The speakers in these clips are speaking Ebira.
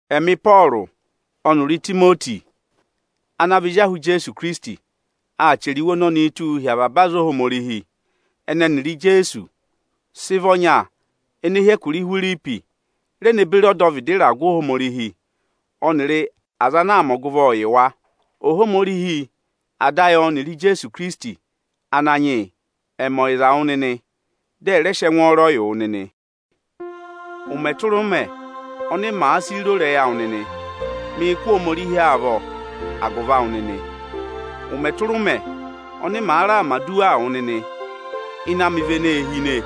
Ẹmị Ịpọọrụ ọnịrị Itimoti ana vị ezi ahụ Ijeesu Ikirisiti aa chẹrẹ iwe ọnọnịị tụ́ụ hi avaba aza Ohomorihi ẹnị ẹnịrị Ijeesu sị vị ọnya ene hi Ihwiripi, re ne beri ọdọvịdị ịragụ Ohomorihi ọnịrị aza ana aa mẹ ọgụvọọ yị wa. Ohomorihi Ada ayị ọnịrị Ijeesu Ikirisiti Ananyị yị ẹ̀ mẹ ọyịza wụ nịnị, dị ẹ rẹ sị ẹngwọọrọ yị wụ nịnị. Ụmẹ tụra ụmẹ oni mèe si ro ịrẹyị awụ nịnị, mịị̄ kụ́ Ohomorihi amị avọ agụvị awụ nịnị nị. Ụmẹ tụra ụmẹ ọnị maa mẹ̀ aduwaa wụ nịnị, ịnẹ amị vị eneē hine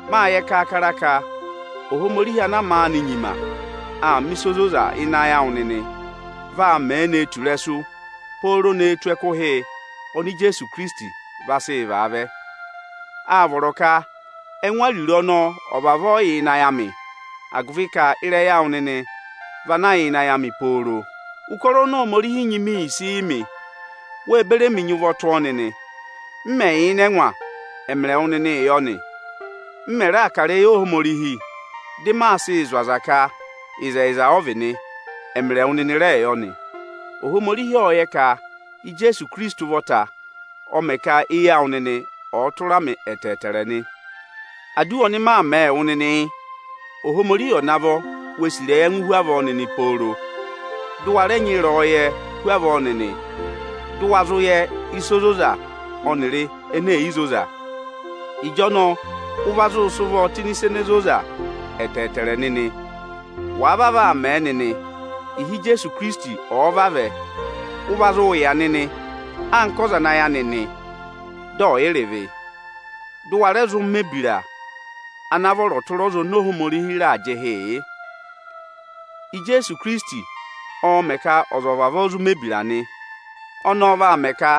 Máa yẹ kaakara ka Ohomorihi ana maanị nyima aa mẹ̀ ịsa ozoza ọnọnị nịnị ayị awụ nịnị vaa mẹẹ nee tù ịrẹsụ pooro ne tù ẹkụhị ọnị Ijeesu Ikirisiti vaa sị vaa vẹ. Áa vọrọ ka ẹngụ ariro ọnọọ ọ̀ vavọọ yà ịnị ayị amị, agụvị ka ịrẹyị awụ nịnị vị anaā yà ịnị ayị amị pooro. Ụkọrọ oni Ohomorihi nyị mi yi sị mị, wé beri emi nyị ụvọ tụ́ ọ nịnị. M Mẹ̀ yà ịnị ẹngwa, ẹmịrị ẹwụ nịnịị yọ nị; m mẹ̀ vaa kà ịrẹyị Ohomorihi dị maa sịị zụ̀ aza ka ịzẹyịza ọ vị nị, ẹmịrị ẹwụ nịnị rẹẹ yọ nị. Ohomorihi ọ́ọ yẹ ka Ijeesu Ikirisiti ụvọta ọ mẹ ka eyi awụ nịnị ọ̀ọ tụra mị ẹtẹẹtẹrẹ nị. Aduwa ọnị maa mẹẹ wụ nịnị yị: Ohomorihi ọ̀ navọ wee sì ịrẹyị ẹngụụ hu avọọ nịnị pooro. Dị ụ wa rẹẹ nyị ịrẹyọyẹẹ hu avọọ nịnị, dị ụ wa zụ yẹ ịsa ozoza ọnịrị ene è yi zoza nịnị. Ịjọnọọ ụ va zụụ sị ụvọọ tụ́ ịnị ịsa ene zoza ẹtẹẹtẹrẹ nịnị. Wàa vavọọ aa mẹ nịnị, ịhị Ijeesu Ikirisiti ọ̀ọ vavẹ, ụ va zụụ yà nịnị anka ọza ana ayị anị nị, dị ọ̀ yị rị ịvị, dị ụ wa rẹ zụụ mẹ̀ ebira ana vọrọ tụra ọza oni Ohomorihi raà jị ịhị yị. Ijeesu Ikirisiti ọọ̄ mẹ̀ ka ọza ọ̀ vavọọ zụ mẹ̀ ebira nị. Ọnọọ vaa mẹ ka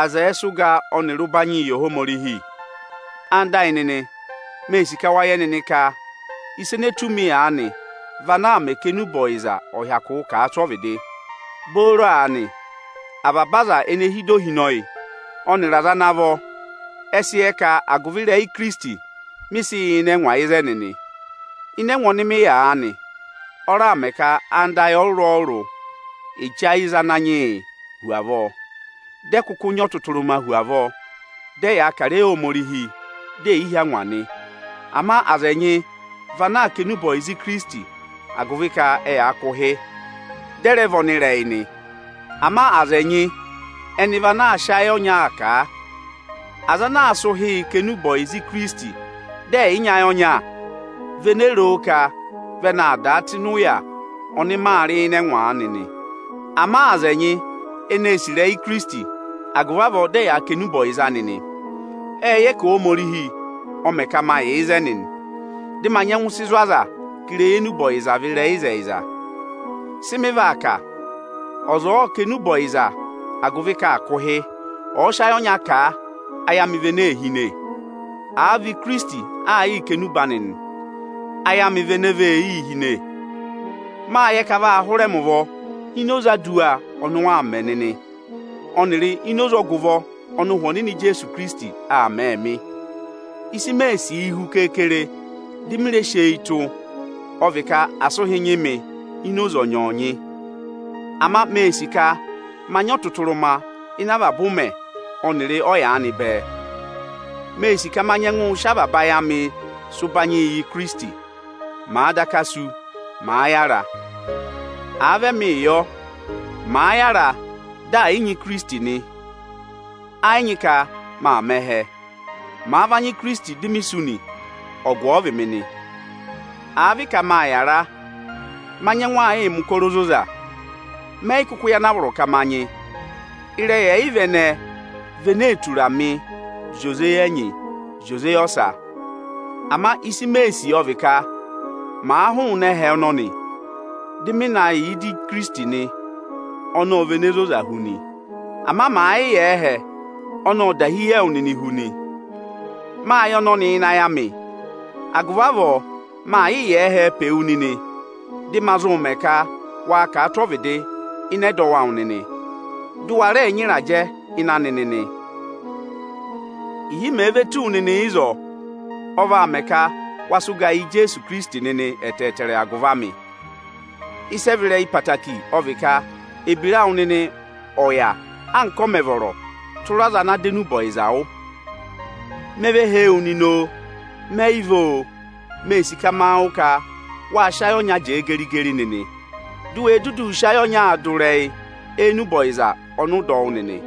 aza ẹ̀ẹ sị ụga ọnịrị ụbanyịị yị Ohomorihi. Ẹwụ nịnị ẹyịnyara amị, mee sì ka wa yẹ nịnị ka ịsa ene tù mi aanị vị ana aa mẹ ka enube ọyịza ọ̀ hyakụụ kà a tụ́ ọvịdị. Booro aanị avaba aza ene hi ịdị ohinọyị ọnịrị aza ana vọ ẹ sị yẹ ka agụvị ịrẹyị Ikirisiti mị yà ịnị ẹngwa nị ịzẹnị nị. Ịnị ẹngwa ọnị mị yà aanị, ọ raà mẹ ka anda ayị ọrụrụ-ọrụrụ e che ayị za Ananyị yị hu avọọ, dị ẹ̀ kụkụ nyị ọtụtụrụma hu avọọ, dị ẹyaa kà ịrẹyị Ohomorihi, di è yi hí angwa nị. Ama aza ẹnyị vị ana aa kà enube ọyịza Ikirisiti agụvị ka ẹyaa kụ̀ ụhị, dị ẹ rẹ vị ọnịrẹyị nị. Ama aza ẹnyị vị ana aa sị ayị ọnyaa kà a. Aza ana aa sị ụhịị kà ọyịza Ikirisiti, dị ẹ̀ yị nyị ayị ọnya, vị ene roo ka vị ẹnị aa dàa tụ́ ịnị ụya ọnị maa rị ịnị ẹngwa aanị nị. Ama aza ẹnyị ene ee sì ịrẹyị Ikirisiti, agụvị avọọ dị ẹyaa kà enube ọyịza anị nị. Ẹ́ẹ yẹ ka Ohomorihi ọ̀ mẹ ka ma yà ịzẹnị nị, dị ma nyẹngụ sị zụ̀ aza ka ịrẹyị enube ọyịza vị ịrẹyị ịzẹyịza. Sị mị vaa kà? Ọza ọ̀ọ kà enube ọyịza agụvị ka aa kụ̀ ụhị, ọ̀ọ va sị ayị ọnya kà a, ayị amị vị ene ee hine. Áa vị Ikirisiti aa yịị kà enube anị nị, ayị amị vị ene vee yii hine. Máa yẹ ka a vaa hụrẹ mị ụvọ ini oze aduwa ọnị ụ waa mẹ nịnị, ọnịrị ini oze ọgụvọ ọnị Ụhwẹ Ọnịnị Ijeesu Ikirisiti aa mẹẹ mị. Ịsị mee sìi hu keekere di mi re si eyi tụ́, ọ vị ka asị ụhị nyị mị ini oze ọnyọọnyị nị. Ama mee sì ka ma nyị ọtụtụrụma ịnị avaba ụmẹ ọnịrị ọyaanị bẹẹ. Mee sì ka ma nyẹngụ sị avaba ayị amị sị ụbanyị yị Ikirisiti, màa daka sú, màa yára. Àa vị ẹmị yọ, màa yára, dị mè yị nyị Ikirisiti nị, ẹ yị nyị ka maa mẹ̀ ẹhẹ. Màa va nyị Ikirisiti, di mi sú nị, ọgụ ọ vị mị nị. Àa vị ka maà yàra, ma nyẹngụ aa yịị mẹ̀ ụkọrọ ozoza; mẹ yị kụkụ yẹ ana a vọrọ ka ma nyị. Ịrẹyị ẹyịva vị ene ee tura mị ị zị oze eyi ẹnyị eyi ọsa. Ama ịsị mee sì ọ vị ka ma hụụnị ẹhẹ ọnọnị, dị ị ma na yà ịdị Ikirisiti nị; ọnọọ ọ vị ene zoza hu nị. Ama màa yị yà ẹhẹ, ọnị ọ dahi yị ẹwụ nịnị hu nị. Máa yẹ ọnọnị ịnị ayị amị; agụvị avọọ, maa yịị yà ẹhẹ pe wu nịnị, dị ma zụ mẹ ka waa kà a tụ́ ọvịdị ịnị ẹdọwụ awụ nịnị, dị ụ wa rẹ nyị ịrajẹ ịnị anị nịnị. Ịhị mèe ve tù wu nịnị ịzọọ, ọ vaa mẹ ka waa sị ụgaa yị Ijeesu Ikirisiti nịnị ẹtẹẹtẹrẹ agụvị amị. Ịsị ẹ vị ịrẹyị obooro ọ vị ka ebira awụ nịnị ọ̀ yà anka ọ mẹ vọrọ tụra ọza ana dọ enube ọyịza wụ́. Me ve hee wu nịnị oo, mẹ yị vẹ oo, mee sì ka ma wụ́ ka wáa sị ayị ọnya jẹẹ geri-geri nịnị, di u we duduu sị ọnyaa dụ ịrẹyị enube ọyịza ọnị ụ dọ wụ́ nịnị.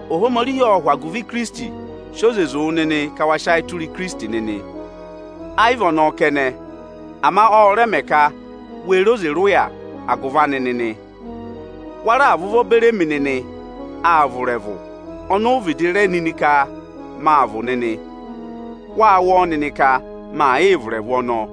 Ohomorihi ộ sị oze wụ nịnị ka wa sị ayị tụra Ikirisiti nịnị. Ẹ yị vị ọnọọ kẹnẹ, ama ọ rẹ mẹ ka we re oze rị ụya nịnị agụvị anị nịnị. Wa raà và ụvọ beri emi nịnị aa vụ̀ ịrẹvụ oni u vịdị re nịnị ka maa vụ̀ nịnị. Wáa wụ́ ọ nịnị ka maa yịị vụ̀ ịrẹvụ ọnọọ.